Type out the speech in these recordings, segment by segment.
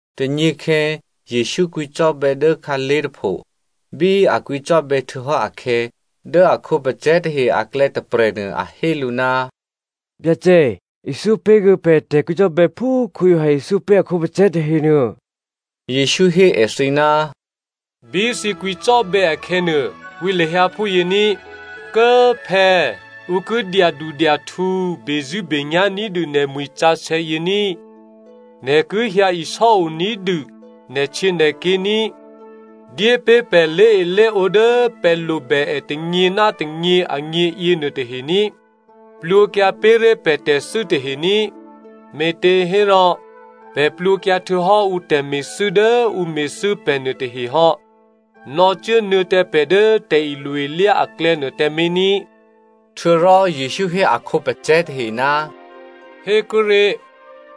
Tônyěkhè̌ Jesǔ kwǐcò́bè̌ dố khǎlé̤ tôpho. Bí a kwǐcò́bè̌ htuô̌hò́ akhè̌, dố a khǒpacè̤̌ tahe aklè̌ tôprè̤nuô a hé lǔ, “Byacè, ithyó pé̤ kuô̌ pè̤ tè̤kwǐcò́bè̌ phú Giovanni ithyó pé̤ a khǒpacè̤̌ tahenuô.” Jesǔ hé èthǐ, “Bí thǐ kwǐcò́bè̌ akhè̌nuô, kwǐ lahyǎ phúyě ní: ‘Kố꤮ phè̌꤮ ǔ ki dyadudyahtǔ bezṳ̂́benyá̤ ní̤dû nè̤mwi̤ sǎsè̌ yě ní꤮. Nè̤ ki hyǎ isò́o ní̤dû nè̤htyěnè̤ké̤ ní꤮. Dyépé̤ pè̤ lé̤elé̤ǒ dố pè̤ lobè è tônyě ná tônyě agně yěnuô tahe ní꤮. Plwǒkyǎ pé̤ré̤ pè̤ tè̤thû́ tahe ní꤮. Me̤těhérò pè̤ plwǒkyǎ htuô̌hò́ ǔ tè̤me̤thû́ dố ǔ me̤thû́ pè̤ nuôtahe hò́. Nò̌cuốnuô̌ tǎ pè̤ dố tè̤ilo-ilyá aklè̌nuô tǎmé̤ ní꤮.’” Htuô̌rò Jesǔ hé a khǒpacè̤̌ tahe, “Hékuốré̤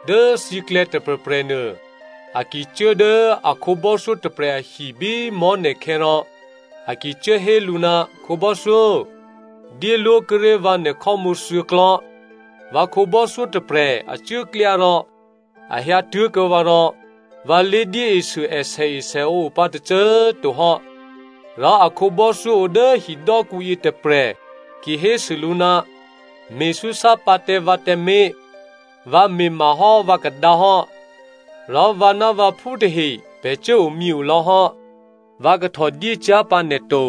dố thǐklè̌ tôprè̤prè̤nuô a ki cuố dố a khǒbò́thyó tôprè̤ ahi bí mò̤́ne̤khè̌ rò a ki cuốhé lǔ, ‘Khǒbò́thyó dyéló̤kuô̌ré̤ vǎ nè̤khò́mǔ thuô̌klò̤́. Vǎ khǒbò́thyó tôprè̤ a cuốklyá rò a hyǎtuố̤kuô̌ vǎ rò vǎ lé̤dyéesû è sèesèǒ o pǎ tôcô꤮ to hò́.’ “Rò a khǒbò́thyó o dố hidò́kǔ yětôprè̤ ki hésû lǔ, ‘Me̤súsá pǎ tǎ vǎ tǎmé̤. Vǎ me̤ mahò́ vǎkadǎ hò́, rò vǎ ná vǎphú tahe pè̤ cuốomyě lò̌ hò́. Vǎ kahtò dyé cyá̤ pǎ nè̤ to.’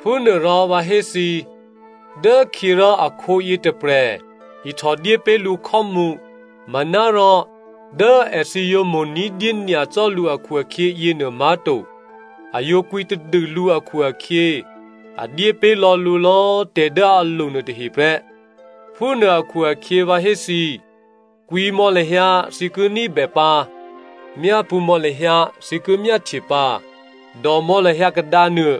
Phúnuôrò vǎ hé thǐ, dốkhyě rò akhǒ yětôprè̤ ihtò dyé pé̤ lǔ khò́mǔ, manárò dố èthǐ yǒ mo̤ ní̤dyé nyacò́ lǔ akhu-akhyě yěnuô má̤to. A yǒ kwǐtadû lǔ akhu-akhyě a dyé pé̤ lò̌ lǔ lò̌꤮ tè̤ dố a lo nuôtahe prè́. “Phúnuô akhu-akhyě vǎ hé thǐ, kwǐ mò̌ lahyǎ, thǐ ki ní̤bè pǎ! Myápṳ̌ mò̌ lahyǎ, thǐ ki myáhtye pǎ. Dòmò̌ lahyǎ kadǎnuô,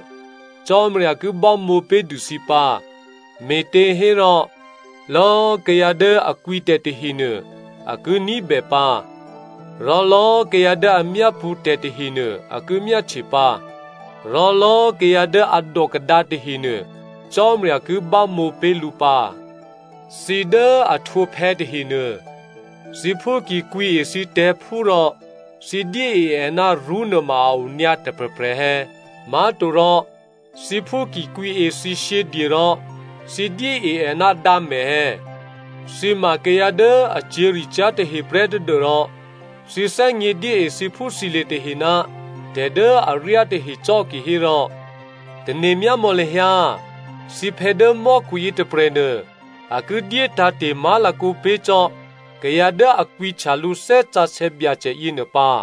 Cò́marya ki bámǒ pé̤dû thǐ pǎ. Me̤těhérò lò̌꤮ kayǎ dố a kwǐtè̤ tahenuô, a ki ní̤bè pǎ, rò lò̌꤮ kayǎ dố a myápṳ̌ tè̤ tahenuô, a ki myáhtye pǎ, rò lò̌꤮ kayǎ dố a dò kadǎ tahenuô, Cò́marya ki bámǒ pé̤ lǔ pǎ. “Thǐ dố a htwǒ phè̌ tahenuô, thǐphú ki kwǐe thǐ tè̤̌phú rò, thǐ dyée è ná rṳ́ nuôma a o nyǎ tôprè̤prè̤ è̌? Má̤torò thǐphú ki kwǐe thǐ shyědye rò thǐ dyée è ná dǎmè̤ è̌? Thǐ ma kayǎ dố a cyě̤ricyá̤ taheprè́ tadû́rò thǐ thè́gně dyée thǐphúthǐlye̤ tahe ná tè̤dố aryá tahe cò́ kihérò, tane̤myámò̌ lahyǎ thǐphè̌ dố mò́khu yětôprè̤nuô, a ki dyé tǎ̤te̤ má̤lakǒ pé̤ cò́ kayǎ dố a kwǐhtya lǔ Thè́ Sǎsè̌ Byacè yěnuô pǎ.”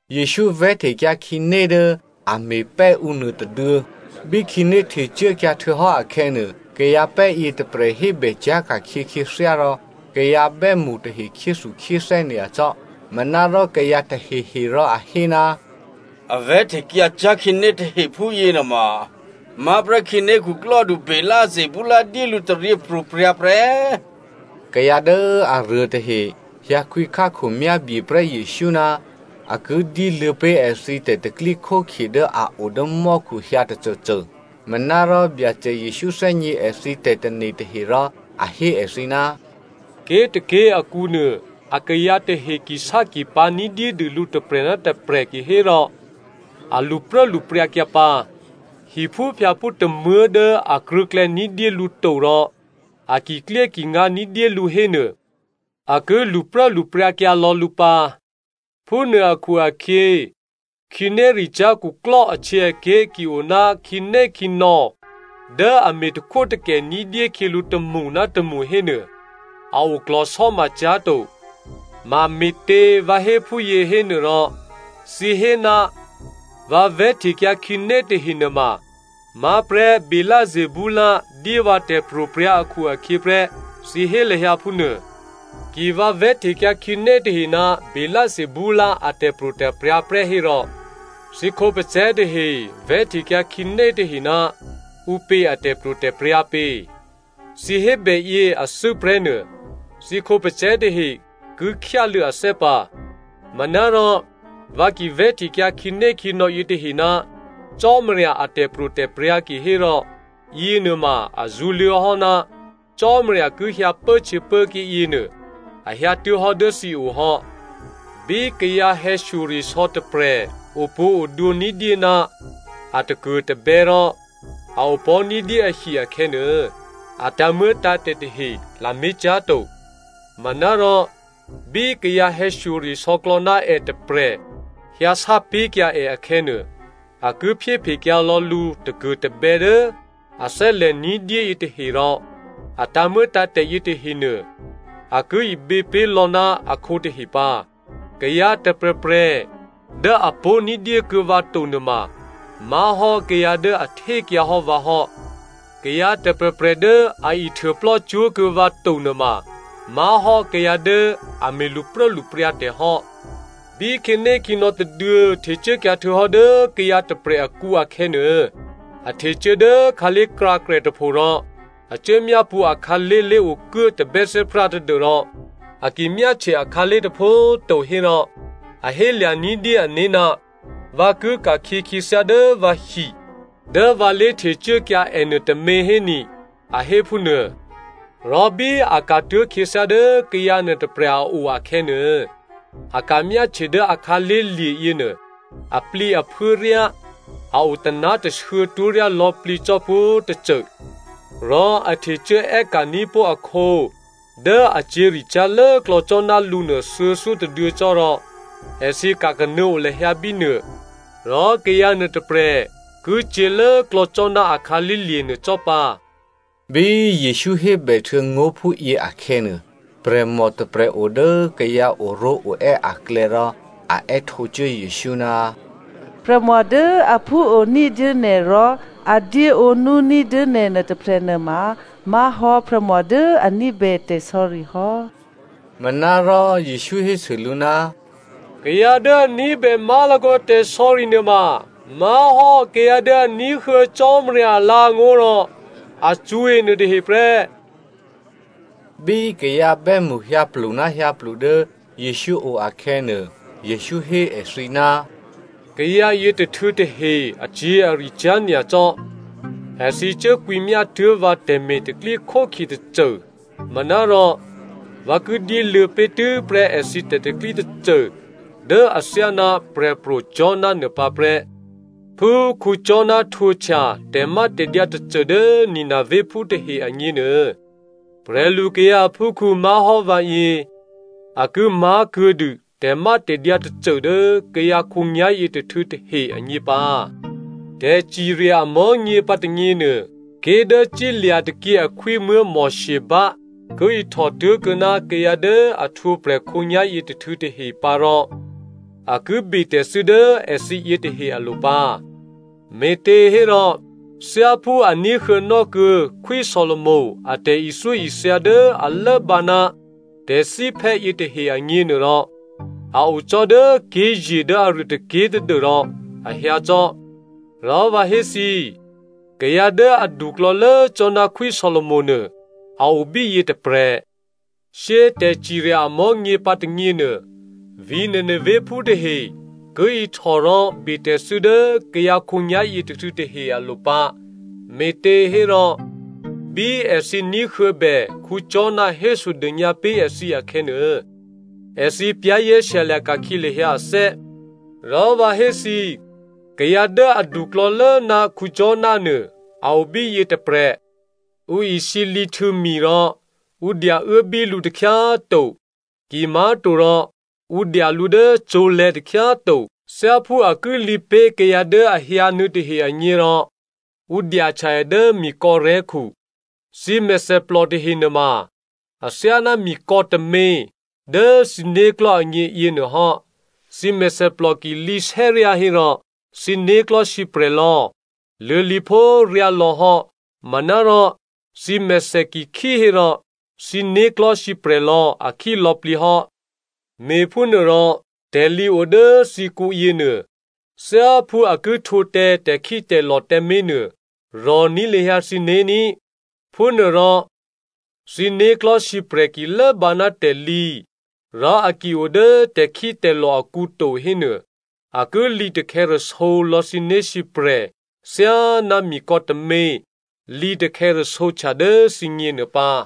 Jesǔ vè̤́htekyǎ khǐné dố a me̤pè́ ǔ nuôtôduô̌. Bí khǐné htecuốkyǎ htuô̌hò́ akhè̌nuô, kayǎpè́ yětôprè̤ hébè cyá̤ ka̤khyě khyěthyá rò kayǎ bè́mṳ tahe khyéthukhyéthè́ nyacò́. Manárò kayǎ tahehe rò a hé, “A vè̤́htekyǎ cyá̤ khǐné tahe phúyě nuôma má̤prè́ khǐné khuklò́du Beelzebul dyé lǔ tè̤taryěpro̤prya̤ prè́.” Kayǎ dố aruô tahe hyǎkwǐ khákhomyábyeprè́ Jesǔ ná a ki dyéluô̌ pé̤ èthǐ tè̤pro̤tè̤prya̤ dố a o dố mò́khu hyǎ tôcôcô. Manárò Byacè Jesǔ thè́gně èthǐ tè̤tane̤ tahe rò a hé èthǐ, “Ké̤tôké̤ akǔnuô akayǎ tahe kisákipǎ̤ ní̤dyédû lǔ tôprè̤ ná tôprè̤ kihérò a lṳpruốlṳpryǎkyǎ pǎ. Hiphúphyǎphú tômuố̤ dố a krṳ̂̌klè̌ ní̤dyé lǔ to rò a kiklyékingǎ ní̤dyé lǔ hénuô, a ki lṳpruốlṳpryǎkyǎ lò̌ lǔ pǎ. Phúnuô akhu-akhyě, khǐnéricyá̤ khuklò́ ahtyěaké̤ ki o ná khǐnékhǐnò̌ dố a me̤takhwótakè ní̤dyé khyělǔ tômṳ ná tômṳ hénuô, a oklò̤sò́ma cyá̤ to. Mame̤tě vǎ hé phúyě hénuôrò, thǐ hé ná vǎ vè̤́htekyǎ khǐné tahe nuôma má̤prè́ Beelzebul dyé vǎ tè̤pro̤prya̤ akhu-akhyě prè́, thǐ hé lahyǎ phúnuô. Ki vǎ vè̤́htekyǎ khǐné tahe ná Beelzebul a tè̤pro̤tè̤prya̤ prè́ hérò, thǐ khǒpacè̤̌ tahe vè̤́htekyǎ khǐnétahe ná ǔpě a tè̤pro̤tè̤prya̤ pě? Thǐ hébè yě athû́ prè́ nuô, thǐ khǒpacè̤̌ tahe ki khyáluô̌ athè́ pǎ. Manárò, vǎ ki vè̤́htekyǎ khǐnékhǐnò̌ yětahe ná Cò́marya a tè̤pro̤tè̤prya̤ kihérò yěnuôma a zṳ̌luô̌hò́ ná Cò́marya ki hyǎ pốhtyěpốké̤ yěnuô a hyǎtuố̤hò́ dố thǐ o hò́. “Bí kayǎ hè̌shyoresò̌ tôprè̤ opwǒ̤odwǒ ní̤dyé ná a takuô̤tabè̌ rò a opò̤́ ní̤dyé ahi akhè̌nuô, a tǎ̤muô̌tǎ̤tè̤ tahe lamé̤ cyá̤ to. Manárò, bí kayǎ hè̌shyoresò̌klò̌ ná è tôprè̤ hyǎsápé̤kyǎ è akhè̌nuô, a ki phyéphekyǎ lò̌ lǔ takuô̤tabè̌ dố a thè́lè̤ ní̤dyé yětahe rò a tǎ̤muô̌tǎ̤tè̤ yětahenuô, a ki ibě pé̤ lò̌ ná akhǒ tahe pǎ. “Kayǎ tôprè̤prè̤ dố a pó̤ ní̤dyékuô̌ vǎ to nuôma, má̤hò́ kayǎ dố a htékyǎ hò́ vǎ hò́. Kayǎ tôprè̤prè̤ dố a ihtuôplò́ cwó̤kuô̌ vǎ to nuôma má̤hò́ kayǎ dố a me̤ lṳpruốlṳpryǎ tè̤ hò́. “Bí khǐnékhǐnò̌ tôduô̌ htecuốkyǎ htuô̌hò́ dố kayǎ tôprè̤ akǔ akhè̌nuô, a htecuố dố khǎlé̤krǎkrè tôpho rò a cuố myápṳ̌ akhǎlé̤ lé̤okuố tabè́thè́prá tadû́rò a ki myáhtye akhǎlé̤ tôpho꤮ to hérò, a hélya̤ ní̤dyé ané̤, ‘Vǎ ki ka̤khyě khyěthyá dố vǎhi dố vǎ lé̤htecuốkyǎ è nuôtômě héni,’ a hé phúnuô. Rò bí a ka̤tuố̤ khyěthyá dố kayǎ nuôtôprè̤ a o akhè̌nuô, a ka̤myáhtye dố akhǎlé̤ lye̤ yěnuô, aplǐaphuố ryá, a o taná̤tashuô̌ twó̤ryá lò̌plǐ cò́ pwǒ̤tôcô. Rò a htecuố è́ka̤ní̤ pó̤ akhǒ dố a cyě̤ricyá̤ lốklò̌ cò́ ná lǔnuô thuô̌thyótôduô̌ cò́ rò èthǐ ka̤kanuô̌ o lahyǎ bínuô. Rò kayǎ nuôtôprè̤ ki cyě̤ lốklò̌ cò́ ná a khǎlé̤lye̤ nuô cò́ pǎ.” Bí Jesǔ hébèhtuô̌ ngó̤ phúyě akhè̌nuô, prè̤mò tôprè̤ o dố kayǎ oró̤oè́ aklè̌ rò a è́htǒcuố Jesǔ, “Prè̤mò dố a phúo ní̤dyé nè̤ rò a dyéǒnú ní̤dyé nè̤ nuôtôprè̤ nuôma má̤hò́ prè̤mò dố a ní̤bè tè̤sò̌ri hò́.” Manárò Jesǔ hésû lǔ, “Kayǎ dố a ní̤bè má̤lakǒ tè̤sò̌ri nuôma má̤hò́ kayǎ dố a ní̤huô̌ Cò́marya alǎ̤angó̤ rò a cṳ̌e nuôtahe prè́.” Bí kayǎ bè́mṳ hyǎplu ná hyǎplu dố Jesǔ o akhè̌nuô, Jesǔ hé èthǐ, “Kayǎ yětôhtû̌ tahe acyě̤aricyá̤ nyacò́. Èthǐ cuốkwǐmyá tuố̤ vǎ tè̤me̤ tè̤pro̤tè̤prya̤ tôcô manárò vǎ ki dyéluô̌ pé̤tû́prè́ èthǐ tè̤pro̤tè̤prya̤ tôcô dố athyáná Prè̤pro̤ Jona nuô pǎ prè́. Phú Jona htwǒhtya tè̤mátè̤dyǎ tôcô dố Ninevephú tahe agněnuô, prè̤lukayǎ aphúkhǔ má̤hò́ vǎyě a ki má̤ kuô̌dû tè̤mátè̤dyǎ tôcô dố kayǎ khǒnyá̤yě tôhtû̌ tahe agně pǎ. Tè̤cirya amò̤́nyě pǎ tônyěnuô, ké̤ dố cílya̤ tôkyě akhwímuố̤ Sheba ki ihtò tố̤kuô̌ ná kayǎ dố a htwǒprè̤ khǒnyá̤yě tôhtû̌ tahe pǎ rò a ki betè̤thû́ dố èthǐ yětahe alo̤ pǎ, me̤těhérò thyáphú a ní̤huô̌nò́ kuô̌ Khwí Solomo a tè̤ithyóithya dố a lốbǎ ná tè̤thíphè́ yětahe agněnuôrò, a o cò́ dố ké̤ye̤ dố aruô tôké̤ tadû́rò a hyǎ cò́. Rò vǎ hé thǐ, kayǎ dố aduklò̌lố cò́ ná Khwí Solomo nuô a o bíyě tôprè̤. Shyé꤮ tè̤cirya amò̤́nyě pǎ tônyěnuô, vǐ̤ Ninevephú tahe ki ihtò rò betè̤thû́ dố kayǎ khǒnyá̤ yětôhtû̌ tahe alo̤ pǎ, me̤těhérò bí èthǐ ní̤huô̌bè Jona hésodônyǎ pé̤ èthǐ akhè̌nuô, èthǐ za̤ ní̤dû kyǎlò̌. Rò vǎ hé thǐ, kayǎ dố aduklò̌lố ná Jona nuô, a o bíyě tôprè̤. “Ǔ isǐlǐ htuô̌ mi rò ǔ dyauốbí lǔ takhyá꤮ to, kimá̤torò ǔ dya lǔ dố cǒ̤lè̤̌ takhyá꤮ to. Thyáphú a ki lǐ pé̤ kayǎ dố a hyǎnuô̌ tahe agně rò, ǔ dyahtya è dố mikò̌rè̤́khu. Thǐ mèthèplò tahe nuôma athyáná mikò̌ tômě dố thǐ né̤klò̤́ agně yěnuôhò́. Thǐ mèthèplò ki lǐsè́ryá hérò, thǐ né̤klò̤́ sǐprè̤lò̌ luô̌lǐphó ryálò̌ hò́, manárò thǐ mèthè ki khí hérò, thǐ né̤klò̤́ sǐprè̤lò̌ a khílò̌plǐ hò́. Me̤phúnuôrò tè̤lǐ o dố thǐkǔ yěnuô, thyáphú a ki htwǒ tǎ tè̤khítè̤lò̤ tǎmé̤nuô, rò̤ní̤ lahyǎ thǐné̤ ní꤮. Phúnuôrò thǐ né̤klò̤́ sǐprè̤ ki lốbǎ ná tè̤lǐ, rò a ki o dố tè̤khítè̤lò̤ akǔ to hénuô, a ki lǐtakhè̌rasǒ lò̌ thǐ né̤sǐprè̤ thyáná mikò̌ tômě lǐ takhè̌rasǒhtya dố thǐgněnuô pǎ.”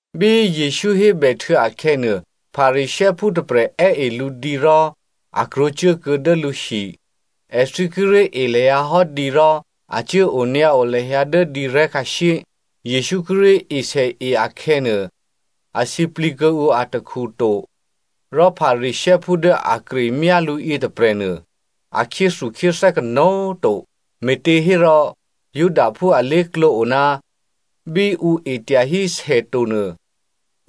Bí Jesǔ hébèhtuô̌ akhè̌nuô, Pharisěophú tôprè̤ è́e lǔ dǐ rò a krwǒcuốkuô̌ dố lǔhi. Èthǐ kíré̤ e lahyǎ hò́ dǐ rò a cuố onyǎo lahyǎ dố dǐrè̤́ khǎshyé. Jesǔ kíré̤ esèe akhè̌nuô, a sǐplǐ kuô̌ǔ atakhu to rò Pharisěophú dố a kremyá lǔ yětôprè̤nuô, a khyéthukhyéthè́ kanó̤꤮ to, me̤těhérò Judaphú alé̤klǒ o ná bí ǔ e tyahí sè tonuô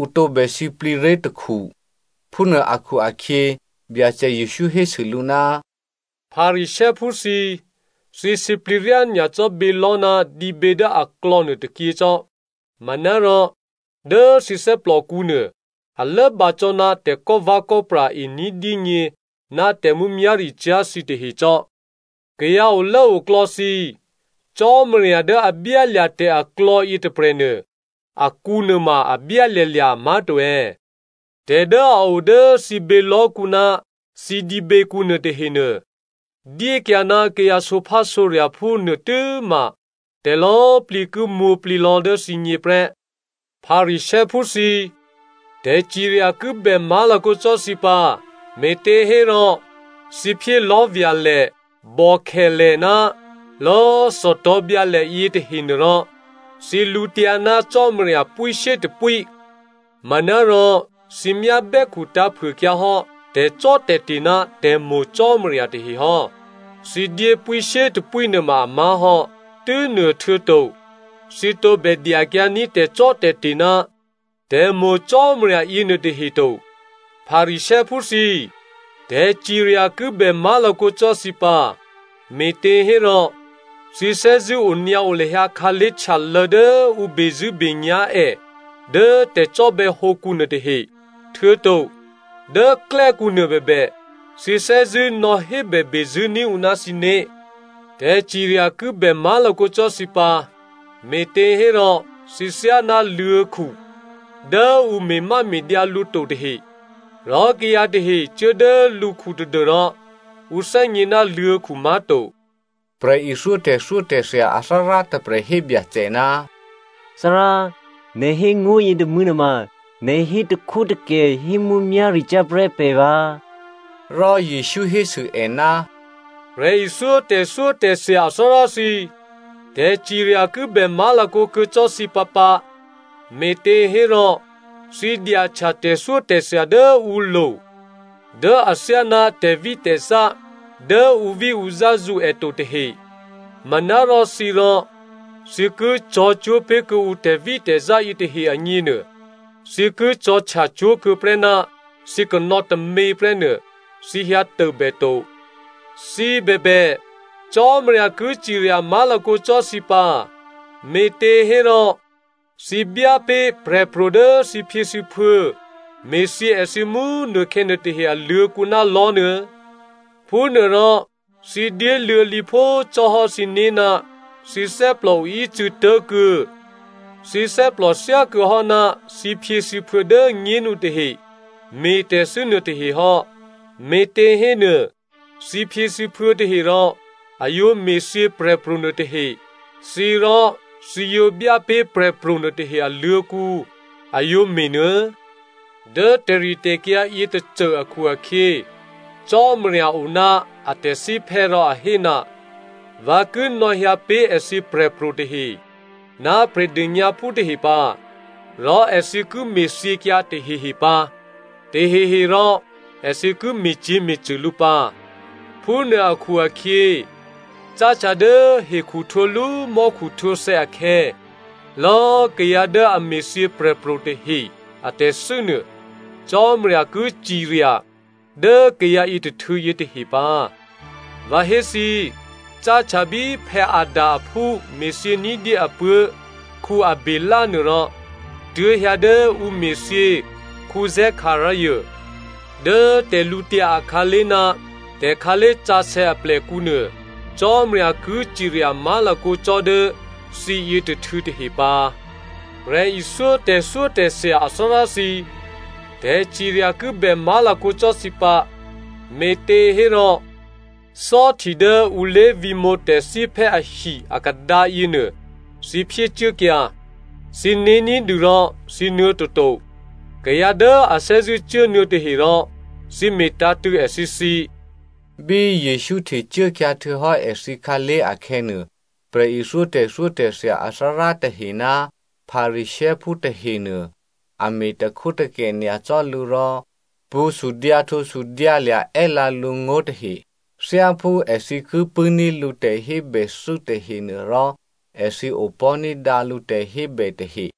ǔ tǒbè sǐplǐré̤ takhu. Phúnuô akhu-akhyě Byacè Jesǔ hésû lǔ, “Pharisěophú thǐ, thǐ sǐplǐ ryá nyacò́ bělò̤́ ná dǐbě dố aklò̌ nuôtôkyě cò́. Manárò dố thǐ thè́plòkǔnuô, a lốbǎ cò́ ná tè̤kò́vè̌kò́pra e ní̤dyényě ná tè̤mǔmyá̤ricyá̤ thǐtahe cò́. Kayǎ olốoklò̌ thǐ꤮, Cò́marya dố a byálya̤ tè̤aklò̌ yětôprè̤nuô, akǔ nuôma a byálya̤lya̤, má̤to è̌? Tè̤ dố a o dố thǐ bělò̤́kǔ ná thǐ dǐběkǔ nuôtahenuô, dyékyǎ ná kayǎ sǒphásǒrya̤phú nuô tû́ma tè̤lò̌꤮ plǐ ki mwǒ̤plǐ lò̌ dố thǐgně prè́. “Pharisěophú thǐ꤮ tè̤cirya ki bè má̤lakǒ cò́ thǐ pǎ, me̤těhérò thǐ phyé lò̤́vya̤lè, bòkhèlè ná lò̌꤮ thòtò̤̌byǎlè yětahenuôrò thǐ lǔtyǎ ná Cò́marya pwíshyétôpwí. Manárò thǐ myá bè́khutǎ̤phuôkyǎhò́ tè̤cò́tè̤te̤ ná tè̤mo̤ Cò́marya tahe hò́. Thǐ dyé pwíshyétôpwí nuôma amá̤ hò́. Tû́nuôhtuô̌to, thǐ tǒbè dyakyǎní̤ tè̤cò́tè̤te̤ ná tè̤mo̤ Cò́marya yěnuôtahe to. “Pharisěophú thǐ꤮, tè̤cirya ki bè má̤lakǒ cò́ thǐ pǎ, me̤těhérò thǐ thè́zṳ̂́ onyǎo lahyǎ khǎlé̤ htyalô̌ dố ǔ bezṳ̂́benyá̤ è dố tè̤cò́bè̌hǒkǔ nuôtahe, htuô̌to dố klè́kǔ nuôbèbè thǐ thè́zṳ̂́ nò̌hébè bezṳ̂́ ní̤ ǔ ná thǐné̤. “Tè̤cirya ki bè má̤lakǒ cò́ thǐ pǎ, me̤těhérò thǐ thyáná luô̤̌khu dố ǔ me̤máme̤dyǎ lǔ to tahe, rò kayǎ tahe cuố dố lǔkhu tadû́rò ǔ thè́gně ná luô̤̌khu má̤to.” Prè̤ithyó tè̤thyótè̤thya athárá tôprè̤ hé Byacè, “Thárá꤮, nè̤ hé ngó̤ yětômû̌ nuôma nè̤ hé takhwótakè hé mǔmyá̤ricyá̤ prè́ pè̤ vǎ.” Rò Jesǔ hésû è, “Prè̤ithyó tè̤thyótè̤thya athárá thǐ꤮, tè̤cirya ki bè má̤lakǒ kuô̌ cò́ thǐ pǎpǎ, me̤těhérò thǐ dyahtya tè̤thyótè̤thya dố ǔlo̤ dố athyáná tè̤vítè̤zá dố ǔvíǔzá zǔ è to tahe, manárò thǐ rò, thǐ ki cò̤̌cwó̤ pé̤kuô̌ǔ tè̤vítè̤zá yětahe agněnuô, thǐ ki cò̤̌htyacwó̤ kuô̌ prè́ ná thǐ kanò̌ tômě prè́nuô, thǐ hyǎtôbè to. “Thǐ bèbè, Cò́marya ki cirya má̤lakǒ cò́ thǐ pǎ, me̤těhérò thǐ byá pé̤ prè̤pro̤ dố thǐphyěthǐphuô̌ me̤thyě èthǐ mú꤮ nukhè̌ nuôtahe aluô̤̌kǔ ná lò̤́ nuô̌. Phúnuôrò thǐ dyéluô̌ lǐphó cò́hò́ thǐné̤ ná thǐ thè́plò oícû̌ tố̤kuô̌, thǐ thè́plò thyákuô̌hò́ ná thǐphyěthǐphuô̌ dố꤮ nyénu tahe me̤tè̤thû́ nuôtahe hò́. Me̤těhénuô thǐphyěthǐphuô̌ tahe rò a yǒ me̤thyě prè̤pro̤ nuôtahe, thǐ rò thǐ yǒ byá pé̤ prè̤pro̤ nuôtahe aluô̤̌kǔ a yǒ me̤nuô̌. Dố tè̤ritè̤kyǎ yětôcô akhu-akhyě, Cò́marya o ná a tè̤thíphè́ rò a hé, ‘Vǎ ki nò̌hyǎ pé̤ èthǐ prè̤pro̤ tahe, ná prè̤dônyǎphú tahe pǎ, rò èthǐ ki me̤thyěkyǎ tahehe pǎ, taheherò èthǐ ki me̤cyě̤me̤cṳ̂ lǔ pǎ.’ Phúnuô akhu-akhyě cáhtya dố hekhuhtwǒlú mò́khuhtwǒthè̌ akhè̌, lò̌꤮ kayǎ dố a me̤thyě prè̤pro̤ tahe a tè̤thû́nuô, Cò́marya ki cirya dố kayǎ yětôhtû̌ yětahe pǎ. Vǎ hé thǐ꤮, cáhtya bí Adam aphú me̤thyě ní̤dyé apuố̤ Abělè nuôrò tuố̤hyǎ dố ǔ me̤thyě Zekaria dố tè̤lǔtyǎ akhǎlé̤ ná tè̤khǎlé̤sǎsè̌ aplèkǔnuô, Cò́marya ki cirya má̤lakǒ cò́ dố thǐ yětôhtû̌ tahe pǎ. “Prè̤ithyó tè̤thyótè̤thya athárá thǐ꤮, tè̤cirya ki bè má̤lakǒ cò́ thǐ pǎ, me̤těhérò thò́hti dố ǔ lé̤vǐ̤mǒ tè̤thíphè́ ahi akadǎ yěnuô, thǐ phyécuốkyǎ. Thǐné̤ ní̤dû rò thǐ nuô̌ toto, kayǎ dố a thè́zṳ̂́ cuốnuô̌ tahe rò thǐ me̤tǎ̤tṳ̂̌ èthǐ thǐ.” Bí Jesǔ htecuốkyǎ htuô̌hò́ èthǐ khǎlé̤ akhè̌nuô, prè̤ithyó tè̤thyótè̤thya athárá tahe ná Pharisěophú tahenuô, a me̤takhwótakè nyacò́ lǔ rò pṳ̌ sudyǎhtǒsudyǎlya̤ è́lǎ lǔ ngó̤ tahe. Thyáphú èthǐ ki pṳ̂́ní̤ lǔ tè̤hébèthû́ tahenuôrò, èthǐ opò̤́ ní̤dǎ lǔ tè̤hébè tahe.